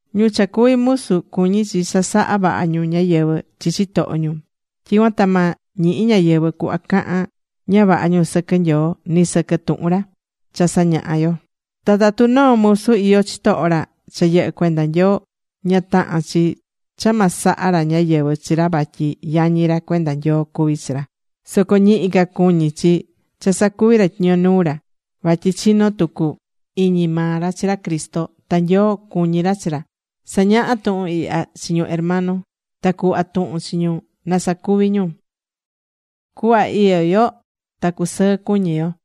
Ñu cha cuvi musu cuñí chi cha sa̱ha vaha ñu ñáyɨvɨ chi chitoho ñu. Tyicuan ta ma ñihi ñáyɨvɨ cuhva cahan ña vaha ñu sɨquɨ Nyoo nɨ sɨquɨ tuhun ra, cha sañahá yo. Ta tatu noo musu iyó chitoho ra cha yɨhɨ́ cuenda Nyoo, ña tahán chi cha ma saha ra ñáyɨvɨ chi ra vatyi yañi ra cuenda Nyoo cuví chi ra. Soco ñihi ca cuñí chi cha sacuví ra tyiño nuu ra, vatyi chinó tucu iñi maa ra chi ra Cristo, ta Nyoo cuñí ra chi ra. Sa̱ñaha tuhun ihya chi ñu hermano ta cu̱hva tuhun chi ñu na sacuvi ñu. Cuhva iyó yo ta cusɨɨ cuñi yo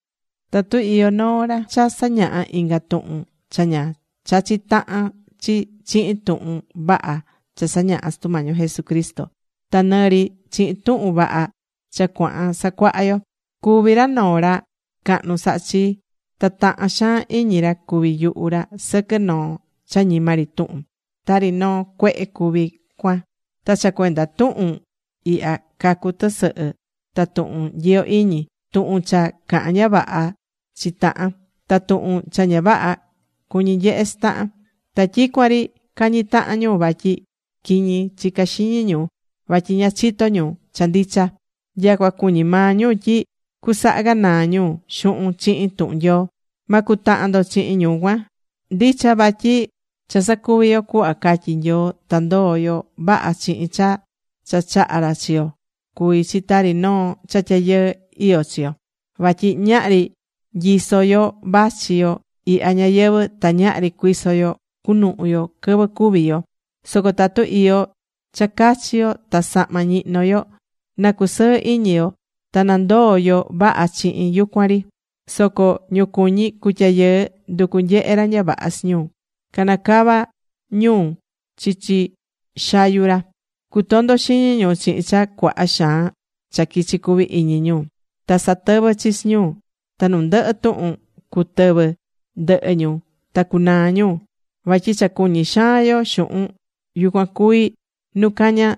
Tatu iyó noo ra cha sañahá inga tuhun cha ña chachí tahan chi chihin tuhun vaha cha sañahá Sutu Mañi yo Jesucristo, ta nɨ ri chihin tuhun vaha cha cuahan sacuaha yo, cuví ra noo ra cahnu sahá chi. Ta tahán xaan iñi ra cuvi yuhu ra sɨquɨ noo cha ñima ri tuhun. Tari noo cuehe cuví cuan. Ta cha cuenda tuhun ihya cacú tɨsɨhɨ ta tuhun nyiyo iñi, tuhun cha cahán ña vaha chi tahan, ta tuhun cha ña vaha cuñí nyehe chi tahan. Ta tyicuan ri cañí tahan ñu vatyi quiñi chica xiñi ñu, vatyi ña chitó ñu cha ndicha. Nyacua cuñí maa ñu tyi cusaha ganaa ñu xuhun chihin tuhun Nyoo. Ma cutahan ndo chihin ñu cuan. Ndicha vatyi cha sacuví yo cuhva catyí Nyoo ta ndoó yo vaha chihin cha cha chaha̱ ra chi yo cuví chi tari noo cha tyayɨɨ iyó chi yo. Vatyi ñahri nyiso̱ yo vachi yo ihya ñayɨvɨ̱. Ta ñahri cuiso yo cunuhu yo quɨvɨ cúvi yo. Soco tatu iyó cha cachi yo ta sahma ñihnó yo, na cusɨɨ iñi yo, ta na ndoo yo vaha chihin yucuan ri. Soco ñu cuñí cutyayɨɨ, nducú nyehe ra ña vaha chi ñu. Caná cava ñu chichi xayu ra. Cutondó xiñi ñu chihin cha cuaha xaan cha quichi cuví iñi ñu. Ta satɨvɨ́ chi chi ñu ta nu ndɨhɨ tuhun cutɨvɨ ndɨhɨ ñu ta cunaa ñu. Vatyi cha cuñí xaan yo xuhun, yucuan cuví nu caña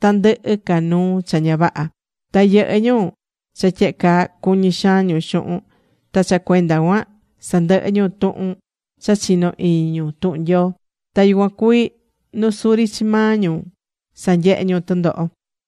tandɨhɨ ca nuu cha ña vaha. Ta yɨhɨ́ ñu cha tyehe caa cuñí xaan ñu xuhun, ta cha cuenda cuan sandɨhɨ́ ñu tuhun cha chinó iñi ñu tuhun Nyoo. Ta yucuan cuví nu suri chi maa ñu sanyehé ñu tɨndoho.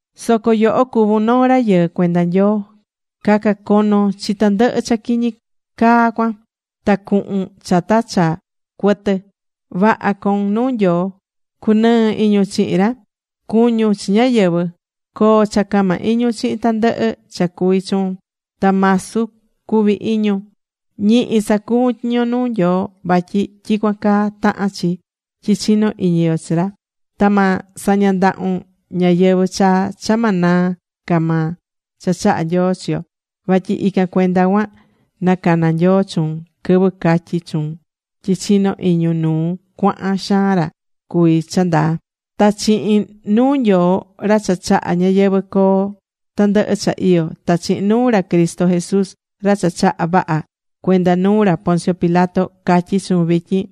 Soco yoho cuvún noo rayɨɨ cuenda Nyoo. Ca̱ca cono chi tandɨhɨ cha quiñi caa cuan. Ta cu̱hun chata cha cuɨtɨ. Vaha co̱un nuu Nyoo. Cu̱nɨɨ iñun chihin ra. Cu̱ñun chi ñáyɨvɨ. Co̱o cha cama iñun chihin tandɨhɨ cha cuví chuun. Ta masu cu̱vi iñun. Ñihi sa̱cuvun tyiño nuu Nyoo vatyi tyicuan caa tahán chi tyi chinó iñi yo chi ra. Ta ma saña ndahun ñayɨvɨ̱ chaa cha ma naa ca maa cha chaha̱ Nyoo chi yo. Vatyi ican cuenda cuan nacana Nyoo chuun, quɨvɨ catyi̱ cachun tyi chinó iñun nuu cuaha xaan ra cuví cha ndaa. Ta chihin nuu Nyoo, ra cha chaha̱ ñayɨvɨ̱ coo tandɨhɨ cha iyó, ta chihin nuu ra Cristo Jesús ra cha chaha̱ vaha cuenda nuu ra Poncio Pilato, catyí chuun vityin,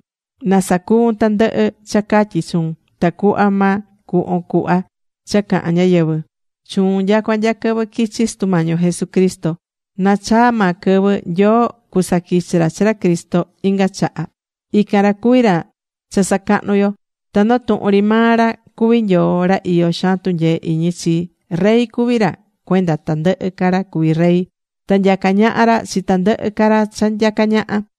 na sacuvun tandɨhɨ cha catyi chuun tacuhva ma cuhvon cuhva cha cahan ñáyɨvɨ chuun nyacua nya quɨvɨ quichi Sutu Mañi yo Jesucristo. Na chaa maa quɨvɨ, Nyoo cusaquichi ra chi ra Cristo inga chaha. Ican ra cuví ra cha sacahnu yo, ta noo tuhun ri maa ra cuví Nyoo ra iyó xaan tunyee iñi chii. Rey cuví ra cuenda tandɨhɨ ca ra cuví rey. Ta nyacá ñaha ra chi tandɨhɨ ca ra cha nyacá ñaha.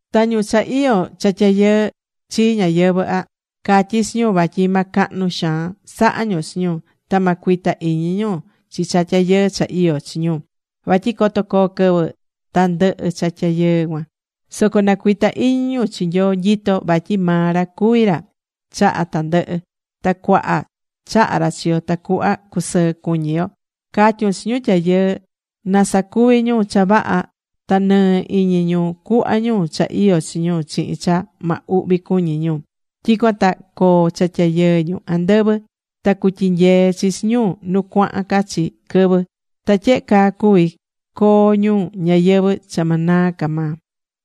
Ta ñu cha iyó cha tyayɨɨ chi ñayɨvɨ̱ ihya, catyí chi ñu vatyi ma cahnu xaan saha ñu chi ñu. Ta ma cuita iñi ñu chi cha tyayɨɨ cha iyó chi ñu. Vatyi coto coo quɨvɨ ta ndɨhɨ cha tyayɨɨ cuan. Soco na cuita iñi ñu chi Nyoo nyitó, vatyi maa ra cuví ra chahá tandɨhɨ. Ta cuaha chaha ra chi yo tacuhva cusɨɨ cuñi yo. Ca̱tyun chi ñu tyayɨɨ na sacuvi ñu cha vaha ta nɨɨ iñi ñu cu̱hva ñu cha iyó chi ñu chihin cha ma uhvi cuñí ñu. Tyicuan ta coo cha tyayɨɨ ñu andɨvɨ ta cutyinyee chi chi ñu nu cuahan ca chi quɨvɨ. Ta tyehe caa cuvi coo ñu ñayɨvɨ̱ cha ma naa ca maa.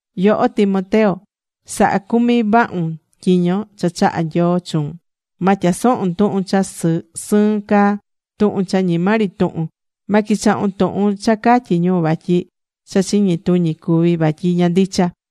Yoho Timoteo sa̱ha cumi vahun tyiño cha chaha̱ Nyoo chuun. Ma tyasohun tuhun cha sɨɨn caa, tuhun cha ñima ri tuhun. Ma quichahun tuhun cha catyí ñu vatyi cha chiñi tuñi cuví, vatyi ña ndicha.